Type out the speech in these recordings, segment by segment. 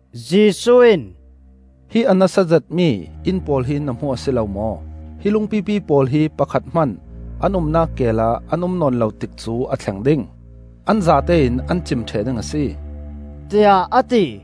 Jesuh in, “Hi a nasa zetmi inn pawl hi na hmu a si lo maw? Hi lungpipi pawl hi pakhat hman an umnak keel ah an um nawn lo tikcu a thleng ding, an zatein an cim ṭheh ding a si,” tiah a ti.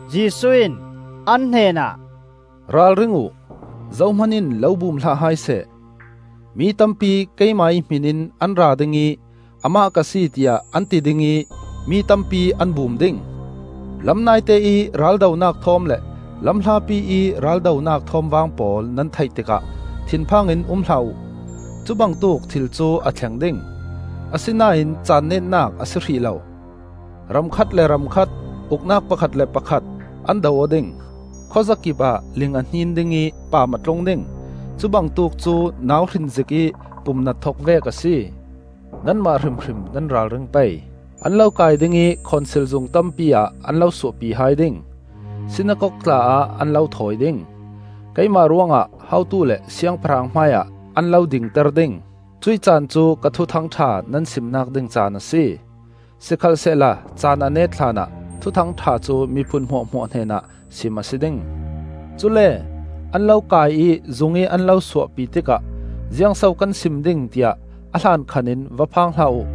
Jesuh in an hnenah, “Ralring uh! Zohman in lo bum hlah hai seh. Mi tampi keimah ih hmih in an ra ding ih ‘Amah ka si,’ tiah an ti ding ih mi tampi an bum ding. Lam naite ih raldonak thawm le lam hlapi ih raldonak thawmvang pawl nan theih tikah thinphang in um hlah uh. Cubangtuk thil cu a thleng ding, asinain caan netnak a si hrih lo. Ram khat le ram khat, uknak pakhat le pakhat, an do aw ding. Khawzakip ah ling a hnin ding ih paam a tlung ding. Cubangtuk cu nauhrin zikih pumnat thok vek a si. “Nanmah hrimhrim nan ralring pei. An lo kai ding ih khonsil zung tampi ah an lo suahpi hai ding; Sinakok tla ah an lo thawi ding; keimah ruangah hotu le siangpahrang hmaiah an lo dingter ding. Cuih caan cu ka Thuthang ṭha nan simnak ding caan a si. Sikhalsehla caan a net hlanah Thuthang ṭha cu miphun hmuahhmuah hnenah sim a si ding. Cule an lo kai ih zungih an lo suahpi tikah ziangso kan sim ding tiah a hlankhan in va phang hlah uh.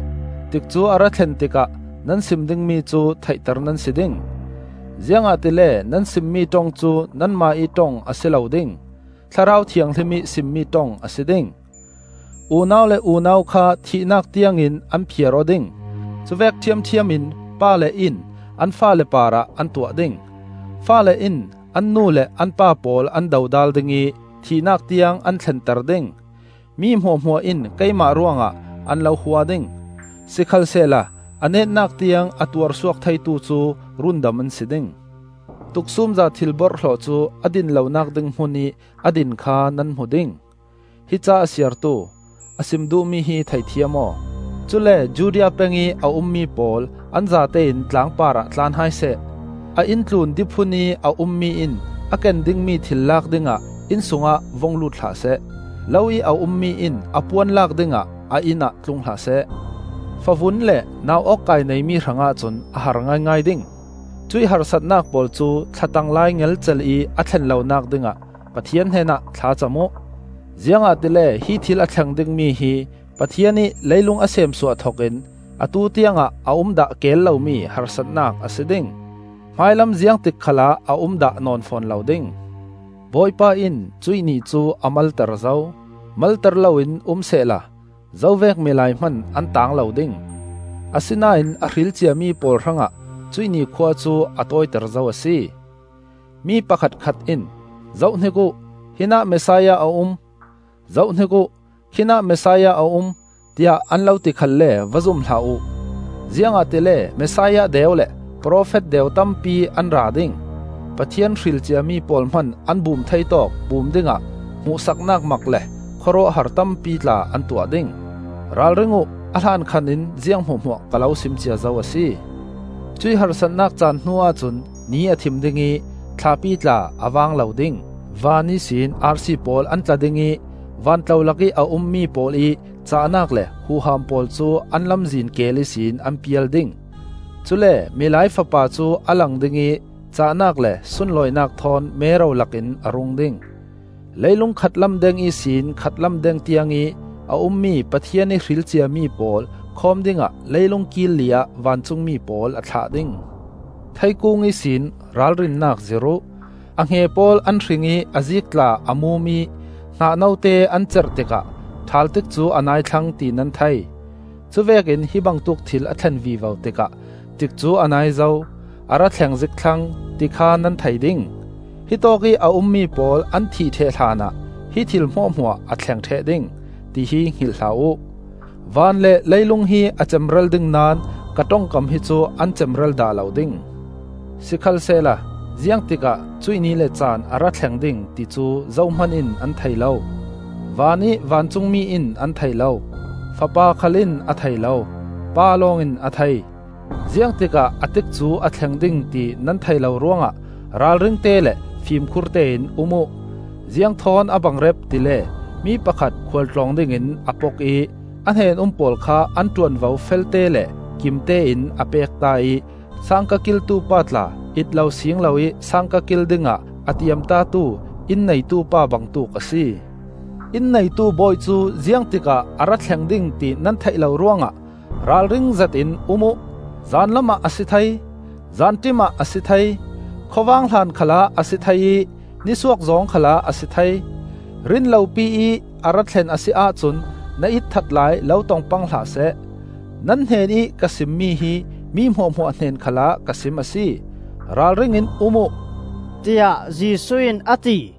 Tikcu a ra thlen tikah nan sim dingmi cu theihter nan si ding. Ziangahtile nan simmi ṭong cu nanmah ih ṭong a si lo ding; Thlarau Thianghlim ih simmi ṭong a si ding. Unau le unau kha thihnak tiangin an phiar aw ding; cuvek ṭhiamṭhiam in pale in an faale parah an tuah ding. Faale in an nu le an pa pawl an dodal ding ih thihnak tiang an thlenter ding. Mi hmuahhmuah in keimah ruangah an lo hua ding. Sikhalsehla a netnak tiang a tuarsuak theitu cu rundam an si ding. “Tuksumza Thil-borhhlawh cu a din lonak ding hmunih a din kha nan hmu ding.” (Hi ca a siartu: a sim duhmi hi theithiam aw.) “Cule Judea pengih a ummi pawl an zatein tlang parah tlan hai seh. A inn tlun diphun ih a ummi in a ken dingmi thil lak dingah inn sungah vung lut hlah seh. Lo ih a ummi in a puan lak dingah a inn ah tlung hlah seh. Favun le nau-awkkai neimi hrangah cun a har ngaingai ding. Cuih harsatnak pawl cu thlatang lai ngelcel ih a thlen lonak dingah Pathian hnenah thlacam uh. Ziangahtile hi thil a thleng dingmi hi Pathian ih leilung a seemsuah thokin atu tiangah a um dah keel lomi harsatnak a si ding. Hmailam ziangtik khalah a um dah nawn fawn lo ding. Bawipa in cuih ni cu a malter zo; malter loin um sehla zovek milai hman an taang lo ding. Asinain a hril ciami pawl hrangah cuih ni khua cu a tawiter zo a si. “Mi pakhatkhat in ‘Zohhnik uh, hinah Messiah a um,’ ‘Zohhnik uh, khinah Messiah a um,’ tiah an lo ti khalle va zum hlah uh. Ziangahtile Messiah deu le profet deu tampi an ra ding. Pathian hril ciami pawl hman an bum thei tawk bum dingah hmuhsaknak mak le khawruahhar tampi tla an tuah ding. Ralring uh! A hlankhan in ziang hmuahhmuah ka lo sim cia zo a si. “Cuih harsatnak caan hnuah cun ni a thim ding ih thlapi tla a vang lo ding. Van ihsin arsi pawl an tla ding ih van tlolak ih a ummi pawl ih cahnak le huham pawl cu an lamzin keel ihsin an pial ding. Cule Milai Fapa cu a lang ding ih cahnak le sunlawinak thawn mero lakin a rung ding. Leilung khatlam deng ihsin khatlam deng tiangih a ummi Pathian ih hril ciami pawl khawm dingah leilung kil li ah vancungmi pawl a thlah ding. “Theikung ihsin ralrinnak zir uh. A hnge pawl an hring ih a ziik tla a mum ih hnah note an cerh tikah ṭhal tikcu a nai thlang ti nan thei. Cuvekin hi bangtuk thil a thlen vivo tikah tikcu a nai zo, a ra thleng zik thlang, ti kha nan thei ding. Hitawkih a ummi pawl an thih ṭheh hlanah hi thil hmuahhmuah a thleng ṭheh ding, ti hi hngilh hlah uh. Van le leilung hi a cemral ding naón ka ṭongkam hi cu an cemral dah lo ding. “Sikhalsehla ziangtikah cuih ni le caan a ra thleng ding, ti cu zohman in an thei lo; vanih vancungmi in an thei lo, Fapa khal in a thei lo, Pa lawng in a thei. Ziangtikah a tikcu a thleng ding ti nan theih lo ruangah ralringte le fimkhur tein um uh! Ziang thawn a bangrep tile mi pakhat khual tlawng dingin a pok ih a hnen-um pawl kha an ṭuanvo felte le kimtein a pekta ih sangka kiltu pa tla it lo siing loih sangka kil dingah a tiamtatu inn neitupa bangtuk a si. Inn neitu bawi cu ziang tikah a ra thleng ding, ti nan theih lo ruangah ralring zetin um uh. Zanlam ah a si thei, zanṭim ah a si thei, khawvang hlan khalah a si thei ih nisuak zawng khalah a si thei. Rinlopi ih a ra thlen a si ahcun na ihthat lai lo tong pang hlah seh. Nan hnenih ka simmi hi mi hmuahhmuah hnen khalah ka sim a si: Ralring in um uh,” tiah Jesuh in a ti.